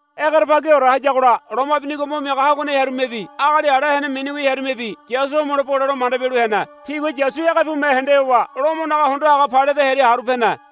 Egerebagiore hayagola loma binigo mo miaga haguane hearumebi agali ala hene miniwi hearumebi Yasu homelo bole lo manda bialu hene. Tigua Yasu ege pume hende howa Lomonaga hondo haga Pailate hearia haru pene.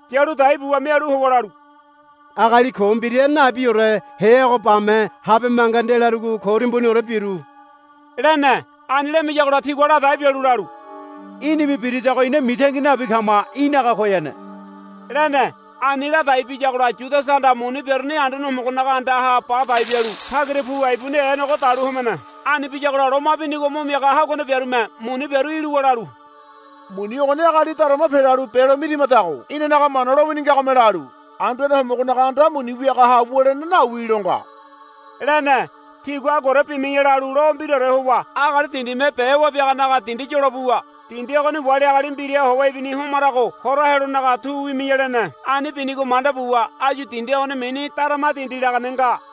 Yalu dai buwa mialu howa lalu, Agali ko mbira nabiore heago bame habe manga ndelarugo ko timbuniore biru, lene. Ani lamiyagola tigua ladai bialu lalu, Í̠nime birigodago ina mitangi nabi kama. Í̠naga koyane, lene. Ani ladai biyagola Yudasahanda muni biaruni Anduane Homogonaga andaha ba dai bialu tagira puwa ibuni eanogo dalu homene. Ani biyagola loma binigo mo miaga haguane biarume muni biaru iluwa lalu, Muni ogoni agali darama pelalu belo mirimadago inanaga Mana lowini ngagome lalu, Anduane Homogonaga anda muni wiagaha wulene nawi, lo nga, lene. Tigua, Aguaore bimi̱ya, lalu lo mbiraore howa agali dindime be wabiaganaga dindi yolo buwa, Dindi ogoni wali agali mbiraha howa ibini homarago hora helonaga tu wimi̱ya, lene. Ani binigo manda buwa áyu dindi ogoni mini Darama Dindi lagane nga.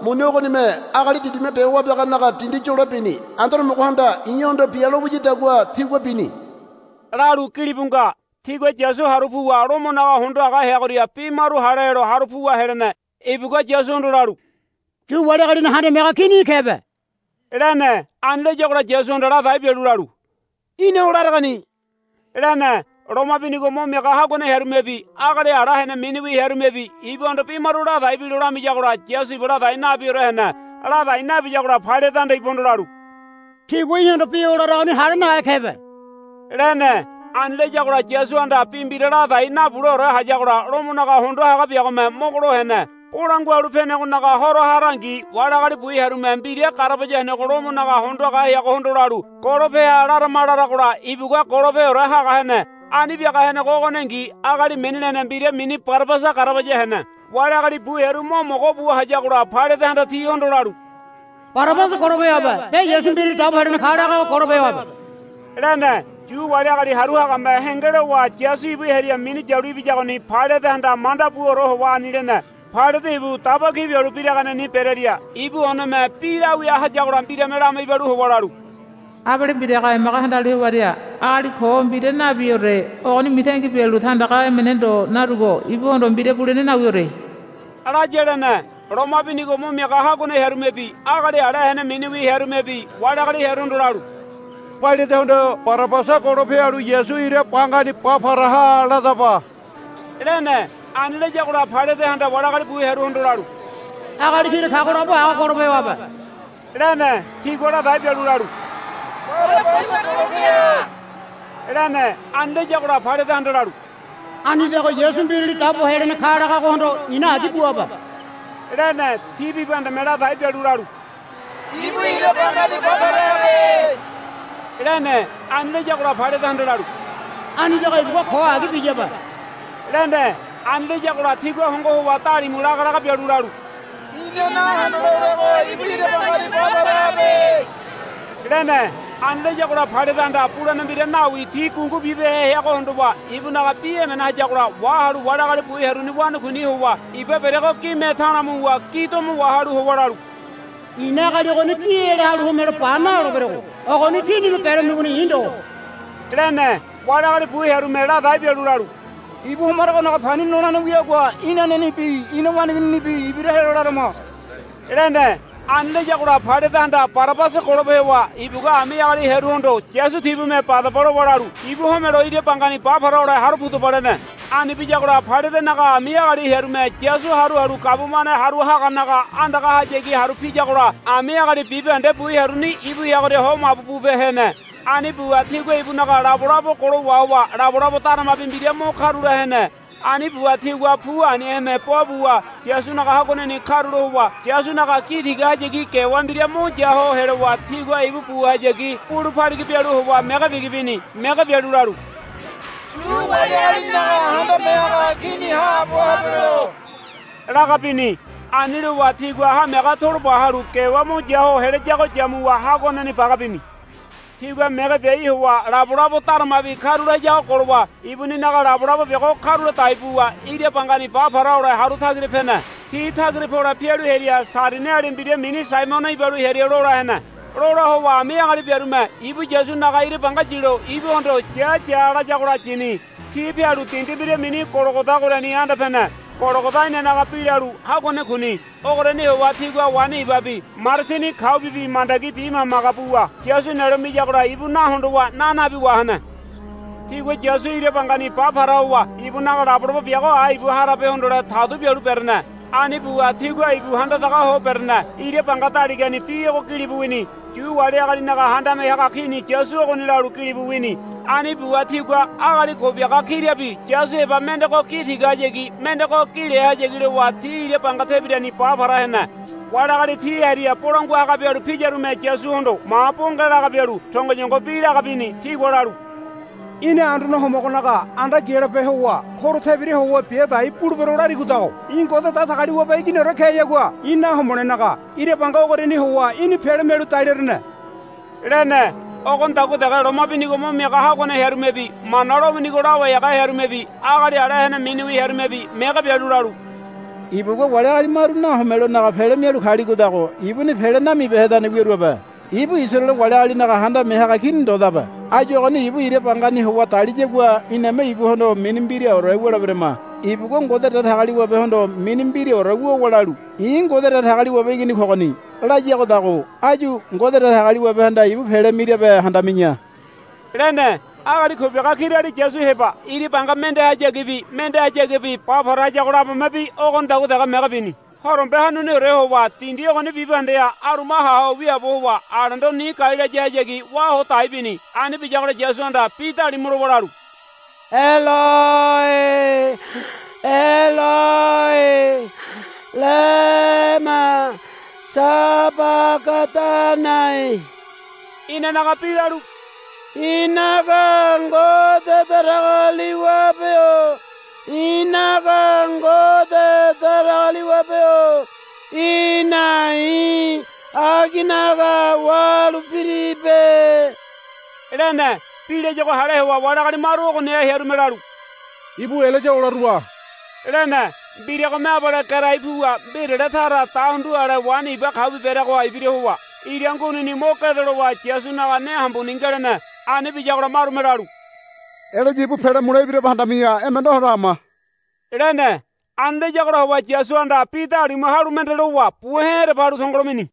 muni ogonime agali dindime be wabiaganaga dindi yolo bini. Anduane Homogohanda i̱hondo, Bia, lo wiyadagua tigua bini, lalu gilibu nga. Tigua Yasu haru puwa Lomonaga hondo haga heagoria bi maru hale helo haru puwa helene. Ibugua Yasuhondo lalu, Yu wali agalinaga handame haga kini í̠ kebe, lene. Ani layagola Yasuhanda ladai bialu lalu, Í̠na o laregoni, lene. Loma binigo mo miaga haguane hearumebi agali ala hene miniwi hearumebi ibuhondo bi maru ladai bilo lamiyagola Yasu ibu ladai nabiore hene. Ladai nabiyagola Pailatehanda ibuhondo lalu, Tigua í̠hondo bi o laragoni hale nahe kebe, lene. Ani layagola Yasuhanda bi mbira ladai nabuleore hayagola Lomonaga hondo haga biagome mogolo hene. Bolangua Halu Penegonaga Horo harangi wali agali bu hearume mbira garabaya henego Lomonaga hondo haga heagohondo lalu, Golope ha larama, laragola ibugua golopeore haga hene. Ani biaga henego ogoningi agali mini lene mbira mini Barabasa garabaya hene. Wali agali bu hearu mo mogo bu hayagola Pailatehanda tihondo lalu, Barabasa golope hoabe be Yasu Mbirali Dabo Helene ka lagago golope hoabe, lene. Yu wali agali haru hagame henge lowa Yasu ibu hearia minu yalu ibiyagoni Pailatehanda manda buore howa ani lene. Pailate ibu daba ki bialu biraganeni berearia ibu oneme bi lawia hayagola mbirame lama ibalu howa lalu, Abale mbiraga emaga handalu hewaria agali ko mbira nabiore ogoni mitangi bialu tandaga emene ndo narugo ibuhondo mbira bulene nawiore, laya, lene. Loma binigo mo miaga haguane hearumebi agali ala hene miniwi hearumebi wali agali hearuhondo lalu, Pailatehondo Barabasa golope halu Yasu ira bangani ba para ha ladaba, lene. Ani layagola Pailatehanda wali agali bu hearuhondo lalu, Agali kira kago labo ago golope hoabe, lene. Tigua ladai bialu lalu, Barabasa golope ha, lene. Ani layagola Pailatehanda lalu, Anidago Yasu Mbirali Dabo Helene ka lagagohondo i̱na agi buabe, lene. Ti bibahendeme ladai bialu lalu, Ibu ira bangani ba para habe, lene. Ani layagola Pailatehanda lalu, Anidago ibugua ko agi biyabe, lene. Ani layagola tigua hongo howa dalimu laga laga bialu lalu, Ina nahondoleorego ibu ira bangani ba para habe, lene. Ani layagola Pailatehanda bulene mbira nawi ti gungu bibehe heago hondowa ibunaga bi emene hayagola wahalu wali agali bu hearuni wanakuini howa iba bereago gime ta̱la̱ muwa gi domo wahalu howa lalu, I̱na agali ogoni gi ela halu homelo ba naloleberogo. Ogoni tínime beramigoni i̱ ndo, lene. Wali agali bu hearume ladai bialu lalu, Ibu homaragonaga pani nolene wiagua inanenibi ina waneigininibi ibira helo larama, lene. Ani layagola Pailatehanda Barabasa golope howa ibugua ami agali hearuhondo, Yasu tibume badaba, lowa lalu, Ibu homelo ira bangani ba para hole haru pudaba, lene. Ani biyagola Pailatenaga ami agali hearume Yasu haru halu gabumane haru haganaga andagahayagi haru piyagola ami agali bibahende bu hearuni ibu heagoria ho mabu bupe hene. Ani buwa tigua ibunaga labolabo golo wahowa labolabo daramabi mbira mo karula hene. Ani buwa tigua pu aniheme bo buwa Yasunaga haguaneni karula howa Yasunaga gi tigahayagi gewa mbira mo ya ho helowa tigua ibu buhayagi bulu paligi bialu howa mege bigi bini. Mege bialu lalu, Yu wali agalinaga Handame Haga Kini haabo habelo, laga bini. Ani lowa tigua hamiaga toloba halu gewa mo ya ho helayago yamuwa haguaneni baga bini. Tigua mege biai howa labolabo daramabi karula hayago golowa ibuninaga labolabo biago karula dai buwa ira bangani ba para hole haru tagira pene. Ti tagira pole pialu hearia Sairiniali mbira mini Saimono ibalu hearia lola hene. Lola howa ami agali biarume ibu Yasunaga ira banga yilo ibuhondo, Ya ya, layagola yini. Ti pialu dindi mbira mini Gologoda ogoriani anda pene. Gologoda inanaga bi lalu, Haguane Kuni. Ogoriani howa tigua waini ibabi marasini kaubibi mandagi bimaga maga buwa Yasu nelo miyagola ibu na hondowa na nabi wahene. Tigua Yasu ira bangani ba para howa ibunaga labolabo biago ái ibu harabe hondole tadu bialu berene. Ani buwa tigua ibu handadaga ho berene. Ira banga daligani bi ogo gilibu wini. Yu wali agalinaga Handame Haga Kini Yasu ogoni, lalu gilibu wini. Ani buwa tigua agali ko biaga kirabi Yasu heba mendego gi tigahayagi mendego gi lehayagi lowa ti ira banga tebirani ba para hene. Wali agali ti hearia bolangua haga bialu piyarume Yasuhondo ma bonge laga bialu tongoyongo bi laga bini. Tigua lalu, Í̠na Anduane Homogonaga anda gialope howa horo tebira howa bia dai bulebero larigodago í̠ Ngode Datagaliwabe Iginiore keyagua í̠ nahomolenaga ira banga ogoriani howa í̠ni pele mialu dalerene, lene. Ogonidagua dege loma binigo mo miaga haguane hearumebi Mana lowinigo lawai haga hearumebi agali ala hene miniwi hearumebi mege bialu lalu, Ibugua wali agali maru nahomelonaga pele mialu kaligodago ibuni pele namibehedane wiaruabe. Ibu Isaraele wali agalinaga handame haga kini ndodabe. Áyu ogoni ibu ira bangani howa daliyagua iname ibuhondo mini mbiraore wuleberama. Ibugua Ngode Datagaliwabehondo mini mbiraore wuwa lalu, I̱ Ngode Datagaliwabe Igini kogoni, layagodago áyu Ngode Datagaliwabehanda ibu pele mirabe handami̱ya, lene. Agali ko biaga kirali Yasu heba ira banga mendehayagibi mendehayagibi ba para hayago labomebi ogonidagua dege mege bini. Horombe hanuniore howa dindi ogoni bibahendeha aruma ha ho wiaabo howa alendo ni gai layahayagi wá hodai bini. Ani biyagola Yasuhanda bi dalimu lowa lalu, Eloi Eloi lema sabagadanai. Inanaga bi lalu, I̱naga Ngode Datagaliwabe-o i̱naga Ngode Datagaliwabe-o í̠na i̱ aginaga wahalu piribe, lene. Bi layago hale howa wali agali maru ogoniha hearume lalu, Ibu Elaya olarua, lene. Mbiragome abale gerai puwa mbirale tara dahundu ale waini iba kaubi bereagoha ibira howa ira ngunini mo gedo lowa Yasunaga ne hambuni ngelene. Ani biyagola marume lalu, Elaya ibu pele mule ibirabe handami̱ya emene hondo hama, lene. Ani layagola howa Yasuhanda bi dalimu halu mende lowa buhe̱ ereba halu tongolo mini.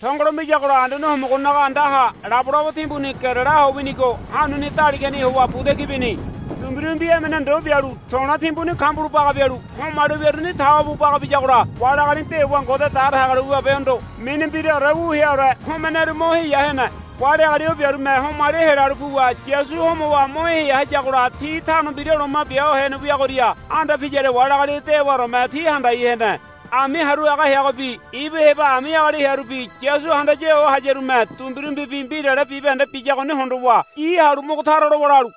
Tongolo miyagola Anduane Homogonaga andaha labolabo timbuni gerela ho winigo hanuni daligani howa buda ki bini. Dumbirumbi emene ndo bialu to̱le̱ timbuni kambulo baga bialu homali wiaruni tawa bu baga biyagola wali agali dewa Ngode Datagaliwabehondo mini mbiraore wu heaore homeneru mo heya hene. Wali agali o biarume homali helalu puwa Yasu homowa mo heya hayagola ti Tano Mbira Loma Bia Hene wiagoria anda piyaria wali agali dewaoreme ti handai hene. Ami haru haga heagobi ibu heba ami agali hearubi Yasu handaya ho hayarume dumbirumbibi mbirale bibahende biyagoni hondowa gi halu mogo tara lowa lalu,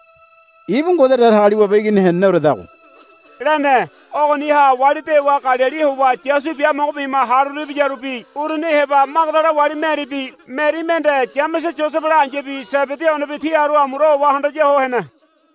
Ibu Ngode Datagaliwabe Igini heneneoredago, lene. Ogoniha wali dewa Galili howa Yasu biamogo bima haruru ibiyarubi uruni heba Magadala wali Meribi Meri mende Yamese Yosebela ai̱yabi Sebedi onebi ti haru amura howa handaya ho hene.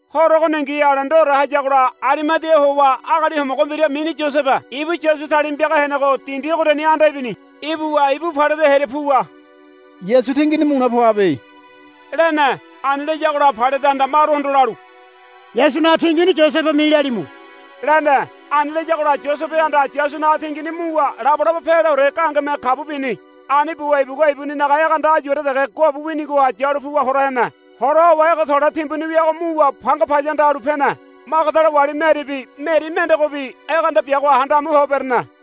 Horo ogoningi alendore hayagola Arimadia howa agali homogo mbira mini Yosebe ibu Yasu talima piaga henego dindi ogoriani anda ibini. Ibuwa ibu Pailate hearia puwa, Yasu tingini mule poabe, lene. Ani layagola Pailatehanda maruhondo lalu, Yasunaga tingini Yosebe milalimu, lene. Ani layagola Yosebehanda Yasunaga tingini muwa labolabo peleore gahengeme kabu bini. Ani buwa ibugua ibuninaga egeanda áyuore dege guabu winigoha yalu puwa hora hene. Hora howa ege to̱le̱ timbuni wiago muwa panga paya anda halu pene. Magadala wali Meribi Meri mendegobi egeanda biagoha handa amu ho berene.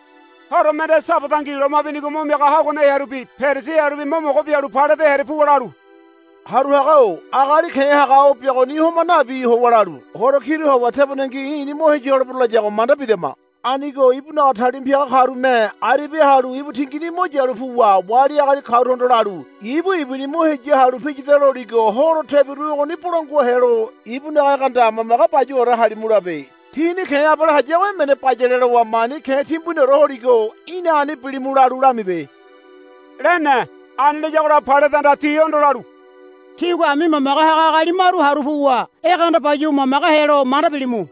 Horo mende Sabadangi loma binigo mo miaga haguane hearubi Perisi hearubi mo mogo bialu Pailate hearia puwa lalu, Haru haga-o agali ke̱ haga o biagoni homa nabi howa lalu, Horo kiru howa tebonengi i̱ni mo heya holebero, layago manda bidama. Anigo ibunaga talima piaga karume aribia halu ibu tingini mo yalu puwa wali agali karuhondo lalu, Ibu ibuni mo heya halu piyada, loligo horo tebiru ogoni bolangua helo ibunaga egeanda mamage bayuwaore halimu labe. Tini ke̱ abale hayago emene bayale lowa mani ke̱ timbuniore holigo í̠na ani bilimu lalu lamibe, lene. Ani layagola Pailatehanda tihondo lalu, Tígua ami mamage haga agali maru haru puwa egeanda bayuwa mamage helo manda bilimu,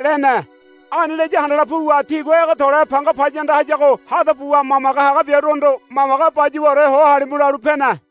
lene. Ani laya handala puwa tigua ege to̱le̱ panga paya anda hayago hada buwa mamage haga biaruhondo, Mamage bayuwaore ho halimu, lalu pene.